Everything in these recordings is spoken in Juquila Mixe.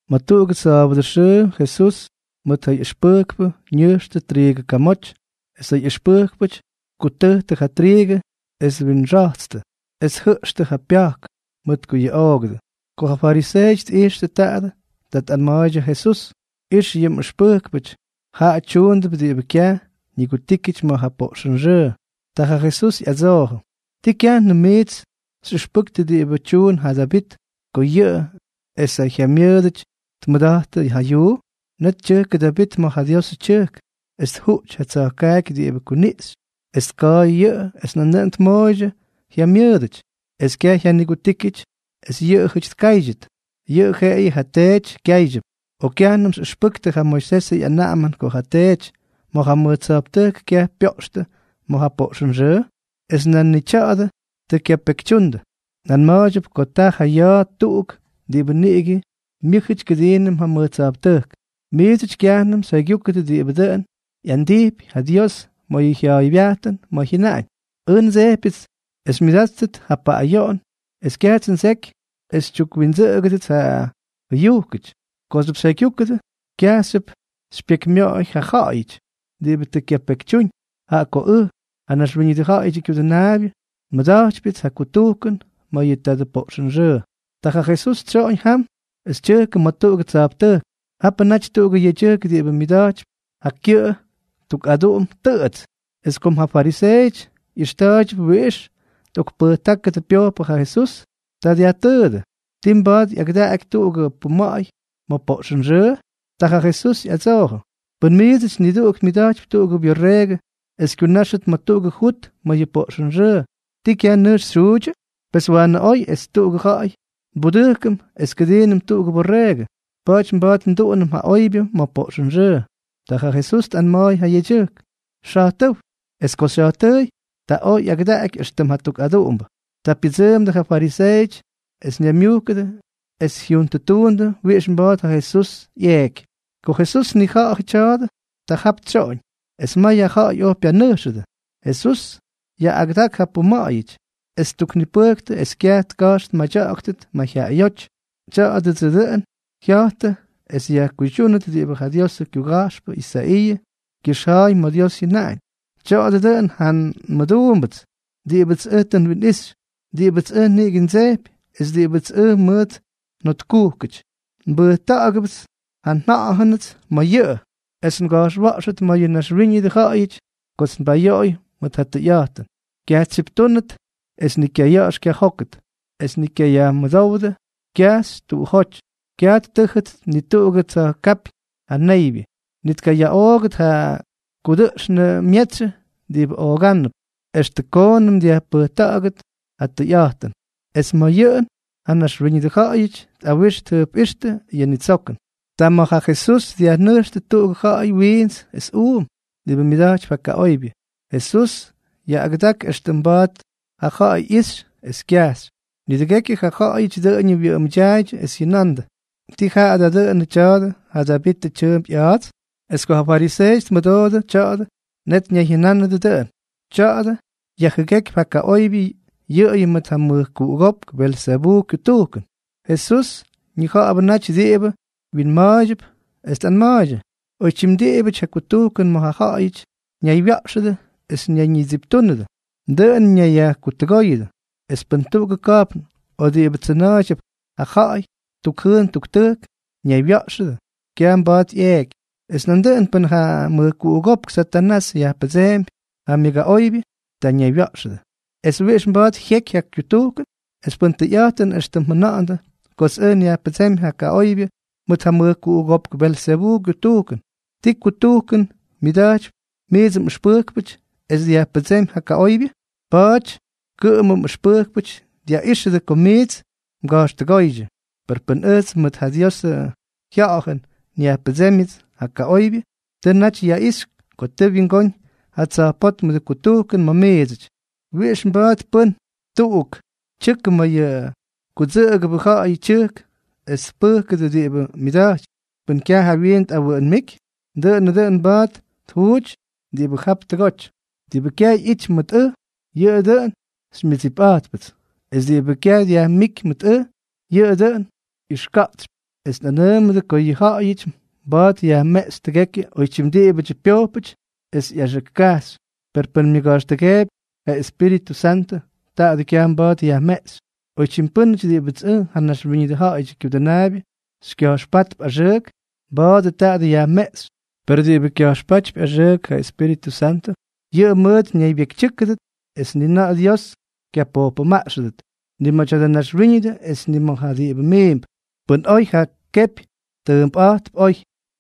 Ma̱ tuꞌugʉ sa̱a̱bʉdʉ xʉʉ Jesús mʉt ja ꞌyʉxpʉjkpʉ ña̱jxtʉ triigʉ kamoty, es ja ꞌyʉxpʉjkpʉty tkutʉjtʉ ja triigʉ, es twinxatstʉ, es tjʉꞌxtʉ ja pya̱jk, mʉt ko yuꞌoogʉdʉ. Ko ja fariseeʉty tꞌijxtʉ taadʉ, ta tꞌanma̱a̱ydyʉ ja Jesús: —Ix yʉ mꞌʉxpʉjkpʉty, jaꞌa tyuundʉp diꞌibʉ kyaj ñigutíkyʉty ma̱ ja poꞌxʉnxʉʉ. Ta ja Jesús ꞌyadsoojʉ: —¿Tii kyajnʉm miits xyꞌʉxpʉktʉ diꞌibʉ tyuun ja Davit ko yʉꞌʉ es ja jyamyʉʉdʉty tmʉda̱jttʉ ja yuu? Net tyʉjkʉ Davit ma̱ ja Diosʉ tyʉjk, es tjuꞌty ja tsa̱jkaaky diꞌibʉ kuniꞌxy, es tka̱a̱y yʉꞌʉ es nandʉꞌʉn tmooydyʉ jyamyʉʉdʉty. Es kyaj jyanigutíkyʉty es yʉꞌʉjʉty tkáydyʉt, yʉꞌʉ jeꞌeyʉ ja teety kyáydyʉp. ¿O kyajnʉm xyꞌʉxpʉktʉ ja Moisesʉ ꞌyanaꞌamʉn ko ja teety ma̱ ja mʉj tsa̱jptʉjk kyaj pyoꞌxtʉ ma̱ ja poꞌxʉnxʉʉ?, es nan ni tya̱a̱dʉ tʉ kyapekytyundʉ. Nꞌanma̱a̱ydyʉp ko taa ja ya̱a̱ tuꞌuk diꞌibʉ niꞌigʉ myʉ́jʉty kʉdiinʉm ja mʉj tsa̱jptʉjk. Miidsʉty kyajnʉm xyjaygyúkʉdʉ diꞌibʉ dʉn ꞌyandijpy ja Dios ma̱ yʉ jyaaybyajtʉn ma̱ jyʉnaꞌañ: “Ʉj ndsejpyʉts es xymyʉdáttʉt ja paꞌꞌayoꞌon, es kyajts ndseky es xytyukwindsʉꞌʉgʉdʉts ja jʉyujkʉty.” Kooxyʉp xyjaygyúkʉdʉ, kyajxyʉp xypyekymyoꞌoy ja ja̱ꞌa̱yʉty diꞌibʉ tʉ kyapekytyúñ. Jaꞌa ko ʉj, ja Naxwíñʉdʉ Ja̱ꞌa̱yʉdyʉ Kyudʉnaabyʉ, nmʉda̱jtypyʉts ja kutujkʉn ma̱ yʉ tadʉ poꞌxʉnxʉʉ. Ta ja Jesús tsyoꞌoñ jam es tyʉjkʉ ma̱ tuꞌugʉ tsa̱jptʉjk. Japʉ naty tuꞌugʉ yedyʉjk diꞌibʉ myʉda̱jtypy ja kyʉꞌʉ tuk aduꞌum tʉꞌʉts. Es kom ja fariseeʉty ꞌyʉxta̱a̱ydyʉp wiꞌix tꞌokpʉjtákʉdʉ pyojpʉ ja Jesús, ta dyajtʉʉdʉ: —¿Tii mba̱a̱t ꞌyagʉdaꞌaky tuꞌugʉ puma̱ꞌa̱y ma̱ poꞌxʉnxʉʉ? Ta ja Jesús ꞌyadsoojʉ: —Pʉ́n miidsʉty niduꞌuk myʉda̱jtypy tuꞌugʉ byorreegʉ es kyunáxʉt ma̱ tuꞌugʉ jut ma̱ yʉ poꞌxʉnxʉʉ, ¿ti kyaj nʉjx xyjuudyʉ? Pes, ¡waanʉ oy es tuꞌugʉ ja̱ꞌa̱y nbudʉjkʉm es kʉdiinʉm tuꞌugʉ borreegʉ! Pa̱a̱ty mba̱a̱t nduꞌunʉm ja oybyʉ ma̱ poꞌxʉnxʉʉ. Ta ja Jesús tꞌanma̱a̱y ja yedyʉjk: —Xa̱jtʉ́w. Es ko xya̱jtʉʉy, ta oj ꞌyagʉdaꞌaky éxtʉm jatuk aduꞌumbʉ. Ta pyʉdsʉʉmdʉ ja fariseeʉty, es ñaymyujkʉdʉ es jyuntʉtuundʉ wiꞌix mba̱a̱t ja Jesús ꞌyeeky. Ko Jesús tnija̱ꞌa̱jʉ tya̱a̱dʉ, ta jap tsyoꞌoñ, es may ja ja̱ꞌa̱y oj pyanʉjxʉdʉ. Jesús yaꞌꞌagʉdak ja puma̱ꞌa̱yʉty, es ttuknipʉjktʉ es kyaj tka̱jx tmadya̱ꞌa̱ktʉt mayjyaꞌayóty. Tya̱a̱dʉdsʉ dʉꞌʉn jya̱jtʉ es yajkuydyúnʉt diꞌibʉ ja Diosʉ kyuga̱jxpʉ Isaiiʉ kyʉxja̱a̱y ma̱ Dios jyʉnáñ: Tya̱a̱dʉ dʉꞌʉn ja nmʉduumbʉts diꞌibʉts ʉj tʉ nwinꞌixy, diꞌibʉts ʉj niꞌigʉ ndsejpy es diꞌibʉts ʉj mʉʉt njotkujkʉty. Nbʉjta̱ꞌa̱gʉpts ja nJa̱ꞌa̱jʉnʉts ma̱ yʉꞌʉ es tka̱jxwa̱ꞌxʉt ma̱ yʉ naxwíñʉdʉ ja̱ꞌa̱yʉty kots nbayoꞌoy mʉt ja tʉyꞌa̱jtʉn. Kyaj tsyiptúnʉt es ni kyaya̱ꞌa̱x kyajókʉt, es ni kyayajmʉdówdʉ kyajxy tuꞌujóty. Kyaj ttʉ́jʉt ni tuꞌugʉ tsa̱jkápyñ ja neybyʉ, ni tkayaꞌoogʉt ja kudʉꞌxnʉ myetsyʉ diꞌibʉ oogánʉp, extʉ koonʉm dyajpʉjta̱ꞌa̱gʉt ja tʉyꞌa̱jtʉn. Es ma̱ yʉꞌʉn ja naxwíñʉdʉ ja̱ꞌa̱yʉty tꞌawix tjʉjpꞌíxtʉ yʉ ñitsokʉn. Ta ma̱ ja Jesús dyajnʉjxtʉ tuꞌugʉ ja̱ꞌa̱y wiints es uum, diꞌibʉ myʉda̱jtypy ja kaꞌoybyʉ. Jesús yaꞌꞌagʉdak éxtʉm mba̱a̱t ja ja̱ꞌa̱y ꞌyixy es kyajxy. Nidʉgekyʉ ja ja̱ꞌa̱yʉty dʉꞌʉñʉ wyʉꞌʉmʉdyaaydyʉ es jyʉnandʉ: —¿Tii jaꞌa da dʉnʉ tya̱a̱dʉ ja Davitʉ tyʉʉmp ꞌya̱a̱ts? Es ko ja fariseeʉty tmʉdoodʉ tya̱a̱dʉ, net ñayjyʉnánʉdʉ dʉꞌʉn: —Tya̱a̱dʉ yajjʉgékypy ja kaꞌoybyʉ yʉꞌʉyʉ mʉt ja mʉjkuꞌugópk Belzebuu kyutujkʉn. Jesús ñija̱ꞌa̱bʉ naty diꞌibʉ wyinma̱a̱ydyʉp, es tꞌanma̱a̱ydyʉ: —Oytyim diꞌibʉty ja kutujkʉn ma̱ ja ja̱ꞌa̱yʉty ñaywya̱ꞌxʉdʉ es ñayñitsiptúnʉdʉ, dʉꞌʉn ñayyajkutʉgóyʉdʉ; es pʉn tuꞌugʉ ka̱jpn o diꞌibʉ tsʉna̱a̱ydyʉp ja ja̱ꞌa̱y tuk jʉʉn tuk tʉjk ñaywya̱ꞌxʉdʉ, kyaj mba̱a̱t jyeky. Es nandʉꞌʉn pʉn ja mʉjkuꞌugópk Satanás yajpʉdseempy ja myʉgaꞌoybyʉ, ta ñaywya̱ꞌxʉdʉ. Pes ¿wiꞌix mba̱a̱t jyeky ja kyutujkʉn? Es pʉn tʉyꞌa̱jtʉn éxtʉm mjʉna̱ꞌa̱ndʉ kots ʉj nyajpʉdsémy ja kaꞌoybyʉ mʉt ja mʉjkuꞌugópk Belzebuu kyutujkʉn, ¿ti kutujkʉn myʉda̱jtypy miidsʉ mꞌʉxpʉjkpʉty es dyajpʉdsémy ja kaꞌoybyʉ? Pa̱a̱ty kʉꞌʉmʉ mꞌʉxpʉjkpʉty dyaꞌíxʉdʉ ko miits mga̱jxtʉgóydyʉ. Per pʉn ʉjts mʉt ja Diosʉ Jya̱ꞌa̱jʉn nyajpʉdsémyʉts ja kaꞌoybyʉ, tʉ naty yaꞌixy ko tʉ wyingóñ ja tsa̱jpótmʉdʉ kutujkʉn ma̱ miidsʉty. ¿Wiꞌix mba̱a̱t pʉ́n tuꞌuk tyʉkʉ ma̱ yʉ kudsʉꞌʉgʉbʉ ja̱ꞌa̱yʉ tyʉjk es tpʉjkʉdʉ diꞌibʉ myʉda̱jtypy pʉn kyaj jawyiin tꞌawʉʉnmíky? Dʉꞌʉnʉ dʉn mba̱a̱t tjuuty diꞌibʉ jap tʉgoty. ’Diꞌibʉ kyaj ꞌyity mʉt ʉj, yʉꞌʉ dʉꞌʉn xymyʉdsipꞌa̱jtpʉts; es diꞌibʉ kyaj dyajmíky mʉt ʉj, yʉꞌʉ dʉꞌʉn ꞌyʉxka̱ꞌtsypy. ’Es nꞌanʉʉmʉdʉ ko yʉ ja̱ꞌa̱yʉty mba̱a̱t yajmeꞌxy tʉgekyʉ oytyim diꞌibʉdyʉ pyojpʉty esʉ ꞌyaxʉk kajxy, per pʉn myʉga̱jxtʉgeepy ja Espíritʉ Santʉ, taadʉ kyaj mba̱a̱t yajmeꞌxy. Oytyim pʉ́nʉty diꞌibʉts ʉj, ja Naxwíñʉdʉ Ja̱ꞌa̱yʉdyʉ Kyudʉnaabyʉ, xykya̱jxpátp axʉʉk, mba̱a̱dʉ taadʉ yajmeꞌxy, per diꞌibʉ tka̱jxpátp axʉʉk ja Espíritʉ Santʉ, yʉꞌʉ mʉʉt ñaybyekytyʉ́kʉdʉt es ni na̱ꞌa̱ Dios kyapojpʉmaꞌxʉdʉt, ni ma̱ tya̱dʉ naxwíñʉdʉ es ni ma̱ ja diꞌibʉ miimp. ’Pʉn oy ja kepy, tʉʉmpꞌa̱jtp oy;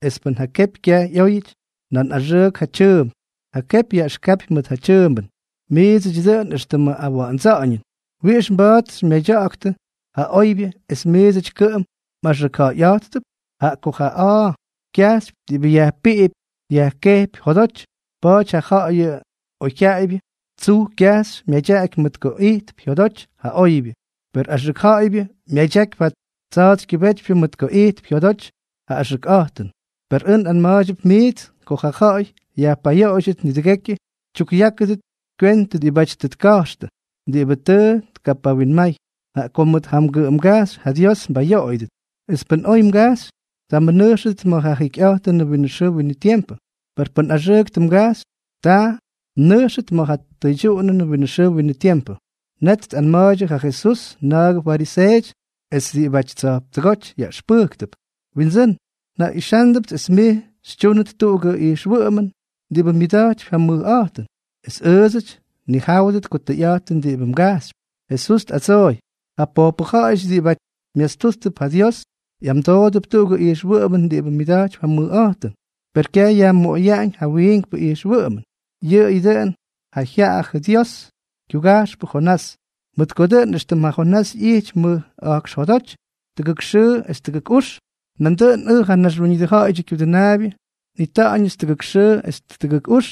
es pʉn ja kepy kyaj ꞌyóyʉty, nan axʉʉk ja tyʉʉmp. Ja kepy yaꞌʉxkapy ma̱ ja tyʉʉmbʉn. ¡Miidsʉty dʉꞌʉn éxtʉmʉ awa̱ꞌa̱ndsa̱ꞌa̱ñʉn! ¿Wiꞌix mba̱a̱t xymyadya̱ꞌa̱ktʉ ja oybyʉ es miidsʉty kʉꞌʉm mꞌaxʉkja̱ꞌa̱yꞌa̱jttʉp? Jaꞌa ko ja a̱a̱ kyajxypy ja diꞌibʉ yajpiꞌipy yajkejpy jodoty. Pa̱a̱ty ja ja̱ꞌa̱yʉ oyjyaꞌaybyʉ tsuj kyajxy myadyaꞌaky mʉt ko ijtp jyodoty ja oybyʉ; per ja axʉk ja̱ꞌa̱ybyʉ myadyakypy ja tsa̱a̱tsykyʉbétypyʉ mʉt ko ijtp jyodoty ja axʉkꞌa̱jtʉn. Per ʉj nꞌanma̱a̱ydyʉp miits ko ja̱ꞌa̱y yajpayoꞌoydyʉt, nidʉgekyʉ tkʉyáktʉdʉ kywentʉ diꞌibáty tʉ tka̱jxtʉ diꞌibʉ tʉ tkapawinmay. Jaꞌa ko mʉt ja mgʉꞌʉmgajxy ja Dios mbayoꞌoyʉdʉt. Es pʉn oy mgajxy, ta mnʉjxtʉt ma̱ ja jikyꞌa̱jtʉnʉ winʉ xʉʉ winʉ tiempʉ; per pʉn axʉʉk tʉ mgajxy, ta mnʉjxtʉt ma̱ ja tʉydyuꞌunʉnʉ winʉ xʉʉ winʉ tiempʉ. Net tꞌanma̱a̱ydyʉ ja Jesús na̱a̱gʉdyʉ fariseeʉty es ja diꞌibʉty tsa̱jptʉgóty yaꞌʉxpʉjktʉp: —Windsʉ́n, njaꞌixándʉpts es mij xytyúnʉt tuꞌugʉ ijxwʉꞌʉmʉn diꞌibʉ myʉda̱jtypy ja mʉjꞌa̱jtʉn, es ʉʉdsʉty nnijáwʉt ko tʉyꞌa̱jtʉn diꞌibʉ mgajxypy. Jesús tꞌadsooy: —Ja pojpʉ ja̱ꞌa̱yʉty diꞌibʉty myastúttʉp ja Dios ꞌyamdoodʉp tuꞌugʉ ijxwʉꞌʉmʉn diꞌibʉ myʉda̱jtypy ja mʉjꞌa̱jtʉn, per kyaj yajmoꞌoyaꞌañ yʉ wiinkpʉ ijxwʉꞌʉmʉn, yʉꞌʉyʉ dʉꞌʉn ja jyaꞌajʉ yʉ Diosʉ kyuga̱jxpʉ Jonás. Mʉt ko dʉꞌʉn éxtʉm ja Jonás ꞌyijty mʉj a̱jkx jodoty tʉgʉk xʉʉ es tʉgʉk ux, nandʉꞌʉn ʉj, ja Naxwíñʉdʉ Ja̱ꞌa̱yʉdyʉ Kyudʉnaabyʉ, nꞌita̱ꞌa̱ñ tʉgʉk xʉʉ es tʉgʉk ux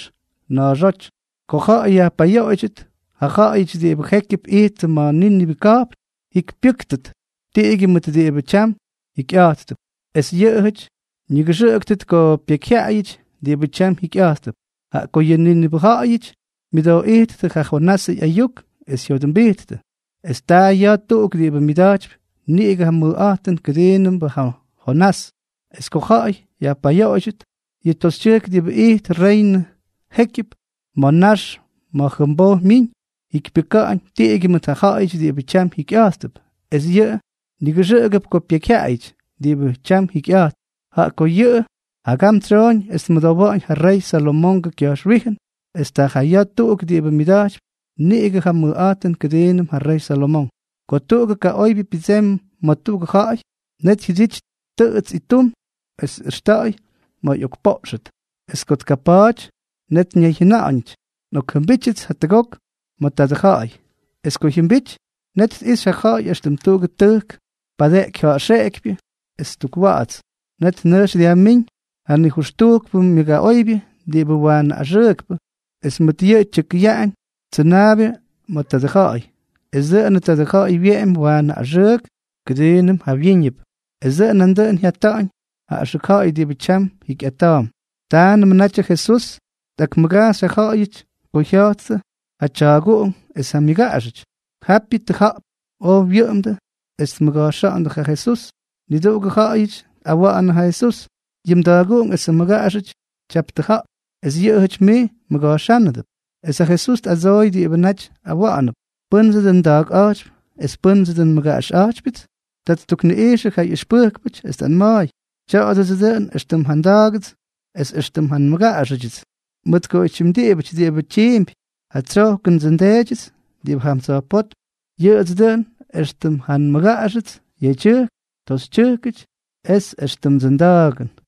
na̱a̱xóty. Ko ja̱ꞌa̱y yajpayoꞌoydyʉt, ja ja̱ꞌa̱yʉty diꞌibʉ jékyʉp ijttʉ ma̱ Nínive ka̱jpn jyikypyʉ́ktʉt tiꞌigyʉ mʉt diꞌibʉ tyam jikyꞌa̱jttʉp. Es yʉꞌʉjʉty ñigʉxʉꞌʉktʉt ko pekyjyaꞌayʉty diꞌibʉ tyam jikyꞌa̱jttʉp, jaꞌa ko yʉ Nínive ja̱ꞌa̱yʉty myʉdooꞌijttʉ ja Jonasʉ ꞌyayuk es jyodʉmbijttʉ, es taa ja ya̱a̱ tuꞌuk diꞌibʉ myʉda̱jtypy niꞌigʉ ja mʉjꞌa̱jtʉn kʉdiibʉm ja Jonás. Es ko ja̱ꞌa̱y yajpayoꞌoydyʉt, yʉ toxytyʉjk diꞌibʉ ijt reynʉ jékyʉp ma̱ nax ma̱ jʉmboj myiñ, jyikypyʉka̱ꞌa̱ñ tiꞌigyʉ mʉt ja ja̱ꞌa̱yʉty diꞌibʉ tyam jikyꞌa̱jttʉp, es yʉꞌʉ nigʉxʉꞌʉgʉp ko pekyjyaꞌayʉty diꞌibʉ tyam jikyꞌa̱jttʉp, jaꞌa ko yʉꞌʉ jagam tsyooñ es tmʉdowa̱ꞌa̱ñ ja rey Salomongʉ kya̱jxwíjʉn, es taa ja ya̱a̱ tuꞌuk diꞌibʉ myʉda̱jtypy niꞌigʉ ja mʉjꞌa̱jtʉn kʉdiibʉm ja rey Salomonk. ’Ko tuꞌugʉ kaꞌoybyʉ pyʉdsemy ma̱ tuꞌugʉ ja̱ꞌa̱y, net jyʉdity tʉꞌʉts ittum es tꞌʉxta̱ꞌa̱y ma̱ ꞌyokpoꞌxʉt. Es ko tkapa̱a̱ty, net ñayjyʉnaꞌañʉty: “Nꞌokjʉmbítyʉts jatʉgok ma̱ tadʉ ja̱ꞌa̱y.” Es ko jyʉmbity, net tꞌijxy ja ja̱ꞌa̱y éxtʉm tuꞌugʉ tʉjk padeꞌeky ja̱ꞌxeꞌekypyʉ es tukwa̱ꞌa̱ts. Net nʉjx dyajmíñ janijʉxtujkpʉ myʉgaꞌoybyʉ diꞌibʉ waanʉ axʉʉkpʉ, es mʉt yʉꞌʉ tyʉkʉyaꞌañ tsʉnaabyʉ ma̱ tadʉ ja̱ꞌa̱y, es dʉꞌʉnʉ tadʉ ja̱ꞌa̱y wyeꞌemy waanʉ axʉʉk kʉdiinʉm jawyíñʉp. Es dʉꞌʉn nandʉꞌʉn jyata̱ꞌa̱ñ ja axʉk ja̱ꞌa̱y diꞌibʉ tyam jikyꞌa̱jttʉp. Támnʉmʉ natyʉ Jesús tꞌakmʉgajxy ja ja̱ꞌa̱yʉty ko jya̱jttʉ ja tya̱a̱guꞌunk es ja myʉgaꞌaxʉty. Japyʉ tʉja̱ꞌp oj wyʉꞌʉmdʉ es tmʉga̱jxa̱ꞌa̱ndʉ ja Jesús. Niduꞌugʉ ja̱ꞌa̱yʉty tꞌawa̱ꞌa̱nʉ ja Jesús: —Yʉ mda̱a̱guꞌunk esʉ mmʉgaꞌaxʉty tyap tʉja̱ꞌp, es yʉꞌʉjʉty mij mmʉga̱jxánʉdʉp. Es ja Jesús tꞌadsooy diꞌibʉ naty awa̱ꞌa̱nʉp: —¿Pʉ́ndsʉ dʉꞌʉn nda̱a̱kꞌa̱jtypy, es pʉ́ndsʉ dʉꞌʉn nmʉgaꞌaxꞌa̱jtypyʉts? Ta ttukniꞌijxʉ ja ꞌyʉxpʉjkpʉty, es tꞌanma̱a̱y: —Tya̱a̱dʉdsʉ dʉꞌʉn éxtʉm ja nda̱a̱gʉts es éxtʉm ja nmʉgaꞌaxʉdyʉts. Mʉt ko oytyim pʉ́nʉty diꞌibʉ tyiimpy ja tsyojkʉndsʉ nDeedyʉts diꞌibʉ jam tsa̱jpótm, yʉꞌʉdsʉ dʉꞌʉn éxtʉm ja nmʉgaꞌaxʉts yedyʉjk toxytyʉjkʉty es éxtʉmdsʉ nda̱a̱gʉn.